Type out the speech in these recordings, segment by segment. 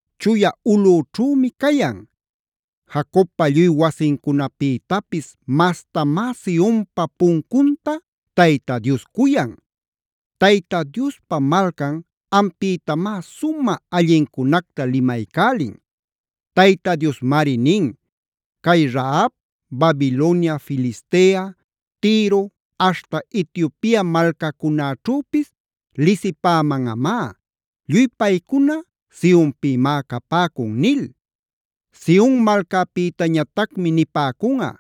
chuya ulꞌućhümi cayan. Jacobpa lluy wasincunapïtapis mastamá Sionpa puncunta Tayta Dios cuyan. Tayta Diospa malcan, ampïtamá sumä allincunacta limaycälin. Tayta Diosmari nin: “Cay Rahab,a Babilonia Filistea, Tiro, aśhta Etiopia malcacunäćhüpis lisipämanꞌamá. Lluy paycuna Sionpïmá capäcun” nil. Sion malcapïtañatacmi nipäcunꞌa: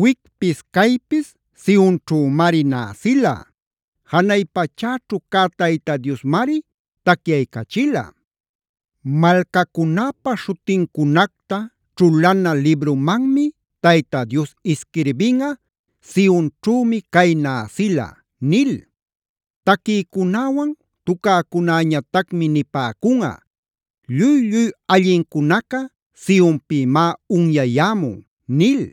“Wicpis caypis Sionćhümari näsila. Janay pachäćhu cä Tayta Diosmari tacyaycachila. Malcacunäpa śhutincunacta ćhulana librumanmi Tayta Dios isquirbinꞌa: ‘Sionćhümi cay näsila’” nil. Taquïcunäwan tucäcunäñatacmi nipäcunꞌa: “Lluy-lluy allincunaca Sionpïmá unyayämun” nil.